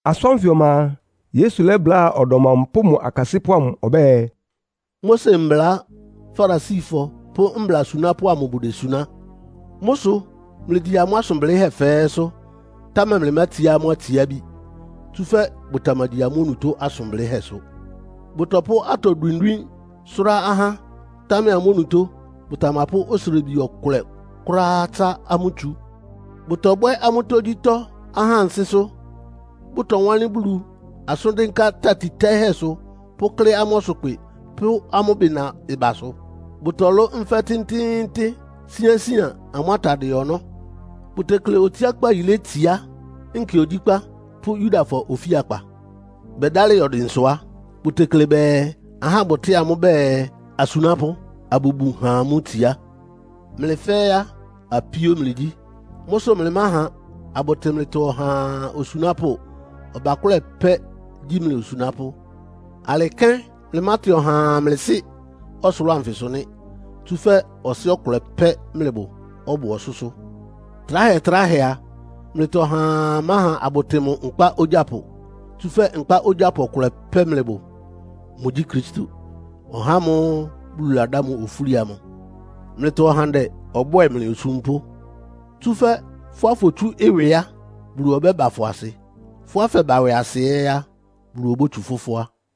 Asʋ́n ánfɩ ɔma a, Yesu lɛ́bláa ɔdɔm amʋ pʋ́ mʋ akasɩ́pʋ́ amʋ ɔbɛ́ɛ, “Mose mbla Farisifɔ pʋ́ Mbla asunápʋ́ amʋ bʋdesuná. Mʋ́ sʋ mlɩgyi amʋ́ asʋn blɩ́hɛ́ fɛ́ɛ́sʋ́, támɛ mlɩmátsiá amʋ́ atsiábi. Tsúfɛ́ bʋtamagyi amʋ́ onutó asʋn blɩ́hɛ́sʋ. Bʋtɔpʋ́ atɔ dwindwín sʋ́rá ahá, támɛ amʋ́ onutó bʋtamapʋ́ osrebi ɔkʋlɛ kʋ́ráá tsá amʋ́ tsu. Bʋtɔbwɛ́ amʋ́ tógyítɔ́ ahá ansɩ́sʋ́. Bʋtɔwánlɩ́n Bulu asʋ́n dɩ́nká tati tɛ́ɩ́hɛ́sʋ, pʋ́klɩ́ amʋ́ ɔsʋkpɩ pʋ́ amʋ́ bɩna ɩbasʋ. Bʋtɔlʋ́ nfɛ́ tɩ́ntɩ́ɩ́ntɩ́n síánsían amʋ́ atadɩɛ ɔnɔ́. Bʋtekle otsiákpá yilé tsiá nkɛ ogyíkpá pʋ́ Yudafɔ Ofíakpa. Bɛdálɩ yɔ dɩnsʋ á, bʋtekle bɛɛ ahá bʋtɩ́ɩ amʋ́ bɛɛ, ‘Asunápʋ́,’ abʋbun ha amʋ́ itsiá. Mlɩ fɛ́ɛ́ á, apíó mlɩgyí. Mʋ́ sʋ mlɩmáha abʋtɩ mlɩtɔ ɔhaa osunápʋ́. Ɔbakʋ́lɛ pɛ́ gyí mlɩ osunápʋ́. Alɩ kɛ́n mlɩmátɩ ɔhaa mlɩ sɩ́ ɔsʋlʋ́ʋ anfɩsʋ nɩ́. Tsúfɛ́ Ɔsɩ́ ɔkʋlɛ pɛ́ mlɩbʋ, ɔbʋ ɔsʋ́sʋ́. Tráhɛtráhɛ a, mlɩtɔ ɔhaa máha abʋtɩ mʋ nkpá ogyápʋ. Tsúfɛ́ nkpá ogyápʋ ɔkʋlɛ pɛ́ mlɩbʋ. Mʋgyí Kristo, (ɔhá ámʋ́ʋ́ Bulu ladá mʋ ofúli amʋ). Mlɩtɔ ɔhandɛ ɔbwɛ́ɛ mlɩ osúmpʋ́. Tsúfɛ́ fʋ́á fotsu ɩwɩ á, Bulu ɔbɛ́ba fʋ asɩ. Fʋ́á fɛba ɩwɩasɩ ɛ́ á, Bulu obótsu fʋ fʋ́á.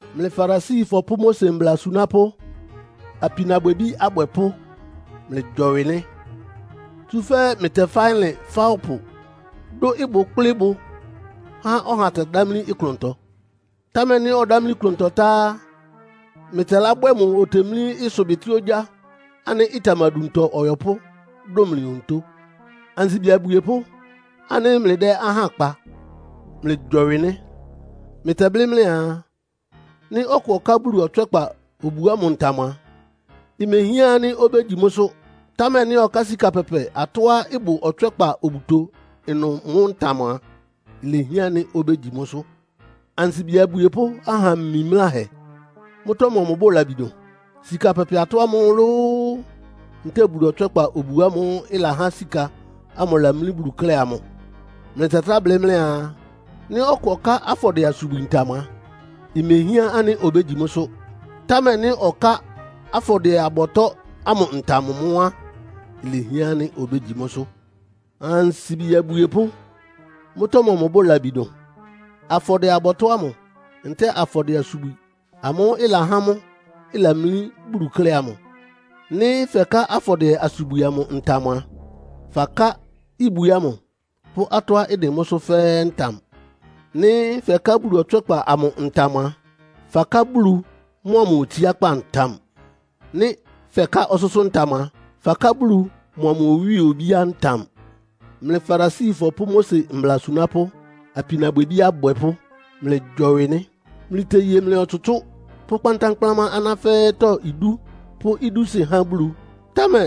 “Mlɩ Farisifɔ pʋ́ Mose mbla asunápʋ́, apinabwɛbí abwɛpʋ́, mlɩgyɔwɩ nɩ́. Tsúfɛ́ mlɩtɛfá ɩlɩn fá ɔpʋ, dʋ́ ɩbʋ kplɩ́ ɩbʋ há ɔha tɛdámlí klʋntɔ. Támɛ nɩ́ ɔdámlí klʋntɔ tá á, mlɩtɛlábwɛ́ mʋ otemlí ɩsʋbɩtɩ́ ogyá ánɩ́ ɩtamaduntɔ ɔyɔpʋ́ dʋn mlɩ onutó. “Ansibi abwiepʋ́ ánɩ́ mlɩdɛ́ ahá kpa, mlɩgyɔwɩ nɩ́. Mlɩtɛblɩ́ mlɩaa, ‘Nɩ́ ɔkʋ ɔká Bulu ɔtswɛ́kpa obu ámʋ ntam a, imehián ánɩ́ obégyi mʋ́sʋ́. Támɛ nɩ́ ɔká sika pɛpɛ atɔ́á ɩbʋ ɔtswɛ́kpa obuto ɩnʋ mʋ́ ntam a, ilehián ánɩ́ obégyi mʋ́sʋ́.’ Ansibi abwiepʋ́! Aha mimláhɛ! Mʋ́tɔ́ mɔmʋ bʋ labi dʋn? Sika pɛpɛ atɔ́ ámʋ lóó, ntɛ́ɛ Bulu ɔtswɛ́kpa obu ámʋ́ʋ́ ɩlahá sika ámʋ lamlí Bulu klɛ́ amʋ? Mlɩtɛtráa blɩ́ mlɩaa, ‘Nɩ́ ɔkʋ ɔká afɔdɩɛ-asubwi ntam a, imehián ánɩ́ obégyi mʋ́sʋ́. Támɛ nɩ́ ɔká afɔdɩɛ-abɔtɔ́ ámʋ ntam mʋ́ á, ilehián ánɩ́ obégyi mʋ́sʋ́.’ Ansibi abwiepʋ́! Mʋ́tɔ́ mɔmʋ bʋ labi dʋn? Afɔdɩɛ-abɔtɔ́ ámʋ ntɛ́ɛ afɔdɩɛ-asubwi ámʋ́ʋ́ ɩlahá mʋ́ ɩlamlí Bulu klɛ́ amʋ? Nɩ́ fɛká afɔdɩɛ-asubwi amʋ ntam a, faká ibwi ámʋ pʋ́ atɔ́á ɩdɩn mʋ́sʋ́ fɛ́ɛ́ ntam. Nɩ́ fɛká Bulu ɔtswɛ́kpa amʋ ntam a, faká Bulu mʋa mʋ otsiákpá ntam. Nɩ́ fɛká ɔsʋ́sʋ́ ntam a, faká Bulu mʋa mʋ owíe obíá ntam. “Mlɩ Farisifɔ pʋ́ Mose mbla asunápʋ́, apinabwɛbí abwɛpʋ́, mlɩgyɔwɩ nɩ́. Mlɩteye mlɩ ɔtsʋtsʋ́ pʋ́ kpántánkplámá aná fɛ́ɛ́tɔ́ idú, pʋ́ idúsɩ́ há Bulu. Támɛ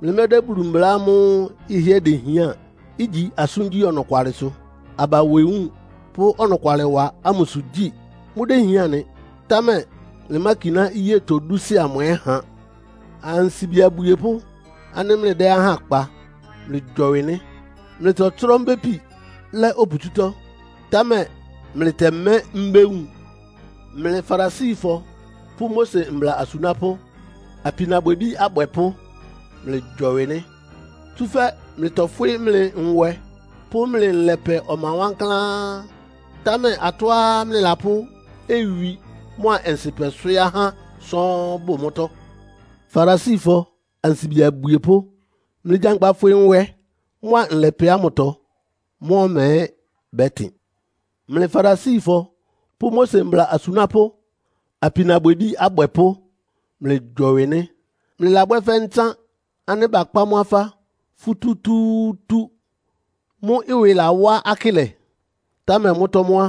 mlɩmɛ́dɛ́ Bulu mbla amʋ́ʋ́ ɩhɩ́ɛ́ dehián, igyi asʋ́ngyí ɔnɔkwalɩsʋ, aba nwewúun pʋ́ ɔnɔkwalɩwa ámʋsʋ gyi. Mʋ́déhián nɩ, támɛ mlɩmákiná iyétɔ dúsɩ́ amʋ ɛ́ ha. Ansibi abwiepʋ́ ánɩ́ mlɩdɛ́ ahá kpa, mlɩgyɔwɩ nɩ́. Mlɩtɔtsrɔ́ mbépi lɛ́ oputsútɔ́, támɛ mlɩtɛmɛ́ mbéwun. “Mlɩ Farisifɔ pʋ́ Mose mbla asunápʋ́, apinabwɛbí abwɛpʋ́, mlɩgyɔwɩ nɩ́. Tsúfɛ́ mlɩtɔfwɩ́ mlɩ nwɛ pʋ́ mlɩ nlɛpɛ ɔma wankláán, támɛ atɔ́á mlɩlapʋ́ owi mʋ́a ɔnsɩpɛ swɩ́ɩ́ ahá sɔ́ɔ́n bʋ mʋ́tɔ́. Farisifɔ ansibi abwiepʋ́, mlɩgyankpa fwɩ nwɛ mʋ́a nlɛpɛ ámʋtɔ, mʋ́ ɔma ɛ́ bɛ́tɩn. “Mlɩ Farisifɔ pʋ́ Mose mbla asunápʋ́, apinabwɛbí abwɛpʋ́, mlɩgyɔwɩ nɩ́. Mlɩlabwɛ́ fɛ́ ntsán ánɩ́ bakpá mʋ́ afá futútúútú, mʋ́ ɩwɩ lawá akɩ́lɛ. Támɛ mʋ́tɔ́ mʋ́ á,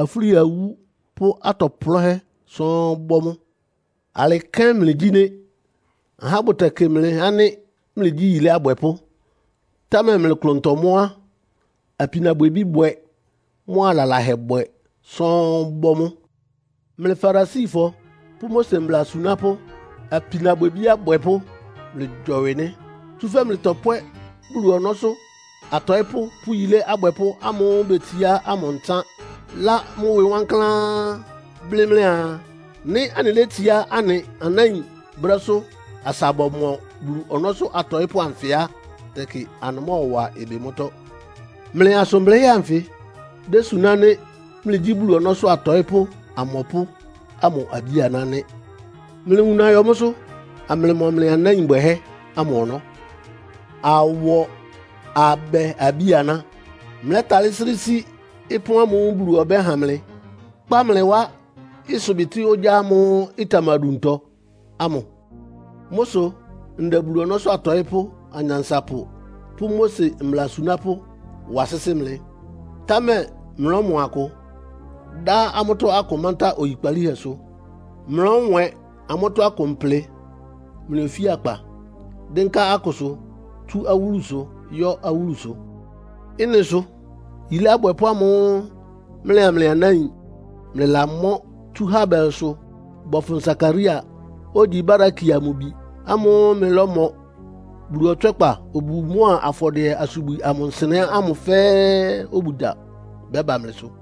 afúli awú pʋ́ atɔ plɔ́hɛ́ sɔ́ɔ́n bɔ́ mʋ́. Alɩ kɛ́n mlɩgyí nɩ́. Ahá bʋtɛkɩ mlɩ ánɩ́ mlɩgyí yilé abwɛpʋ́. Támɛ mlɩ klʋntɔ mʋ́ á, apinabwɛbíbwɛ mʋ́a lalahɛbwɛ sɔ́ɔ́n bɔ́ mʋ́. “Mlɩ Farisifɔ pʋ́ Mose mbla asunápʋ́, apinabwɛbí abwɛpʋ́, mlɩgyɔwɩ nɩ́. Tsúfɛ́ mlɩtɔpwɛ́ Bulu ɔnɔ́sʋ́ atɔɩ́pʋ́ pʋ́ yilé abwɛpʋ́ ámʋ́ʋ́ betsiá ámʋ ntsán, lá mʋ́ ɩwɩ wankláán, blɩ́ mlɩaa, ‘Nɩ́ anɩlétsiá anɩ anáin brɛ́sʋ́ asa bɔmɔ Bulu ɔnɔ́sʋ́ atɔɩ́pʋ́ anfɩ á, tɛkɩ anɩmɔ́wa ɩbɩ mʋ́tɔ́.’ Mlɩ asʋn blɩ́hɛ́ anfɩ désuná ánɩ́ mlɩgyí Bulu ɔnɔ́sʋ́ atɔɩ́pʋ́ amɔpʋ́ ámʋ abí-aná nɩ́. Mlɩwuna yɔ mʋ́sʋ́, amlɩmɔ mlɩ anáin bwɛhɛ́ ámʋ ɔnɔ́. Awɔ, abɛ abí-aná! Mlɛ́talɩ́ srɩ́ sí ɩpɔ́n ámʋ́ʋ́ Bulu ɔbɛ́ha mlɩ, kpá mlɩ wá ɩsʋbɩtɩ́ ogyá ámʋ́ʋ́ ɩtamaduntɔ ámʋ? Mʋ́ sʋ ndɛ Bulu ɔnɔ́sʋ́ atɔɩ́pʋ́, anyansapʋ pʋ́ Mose mbla asunápʋ́ wa sɩ́sɩ́ mlɩ. Támɛ mlɔ́mɔ akʋ, dá amʋ́tɔ́ akʋ mántá oyikpalíhɛsʋ. Mlɔ́nwɛn amʋ́tɔ́ akʋ mplɩ mlɩ ofíakpa, dɩ́nká akʋsʋ tsú awúlusʋ yɔ́ awúlusʋ. Ɩ́nɩ sʋ yilé abwɛpʋ́ ámʋ́ʋ́ mlɩa mlɩ anáin mlɩlamɔ́ tsú Habelsʋ bɔfʋn Sakaria, ogyi Barakia mʋ bi ámʋ́ʋ́ mlɩlɔ́mɔ Bulu ɔtswɛ́kpa obu mʋ́a afɔdɩɛ-asubwi amʋ nsɩnɛ́ ámʋ fɛ́ɛ́ obugya bɛ́ba mlɩsʋ.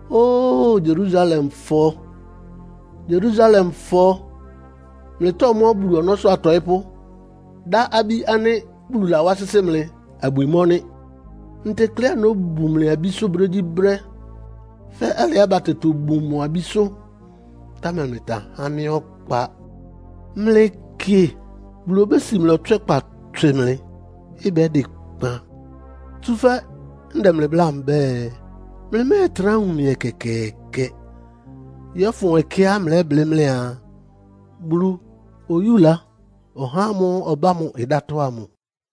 “Óo Yerusalemfɔ, Yerusalemfɔ! Mlɩtɔ́mɔ́ Bulu ɔnɔ́sʋ́ atɔɩ́pʋ́, dá abí ánɩ́ Bulu lawá sɩ́sɩ́ mlɩ abwi mɔ́ nɩ́. Ntekleá nóbun mlɩ abísʋ́ brégyíbrɛ́, fɛ́ alɩá batɛ tobun mʋ abísʋ́, támɛ mlɩtamahá mɩ́ ɔkpa. Mlɩkɩ, Bulu obési mlɩ ɔtswɛ́kpa tswɩ mlɩ, ɩbɛ́dɩ kpan. Tsúfɛ́ ndɛ mlɩ bláa mbɛ́ɛ, mlɩmɛ́ɛtrá wun mɩ ɛkɛkɛɛkɛ, yɔ́fʋn ɛkɛá mlɛ́blɩ́ mlɩaa, ‘Bulu oyúla ɔhá ámʋ́ʋ́ ɔbá mʋ ɩdátɔ́.’ ámʋ.”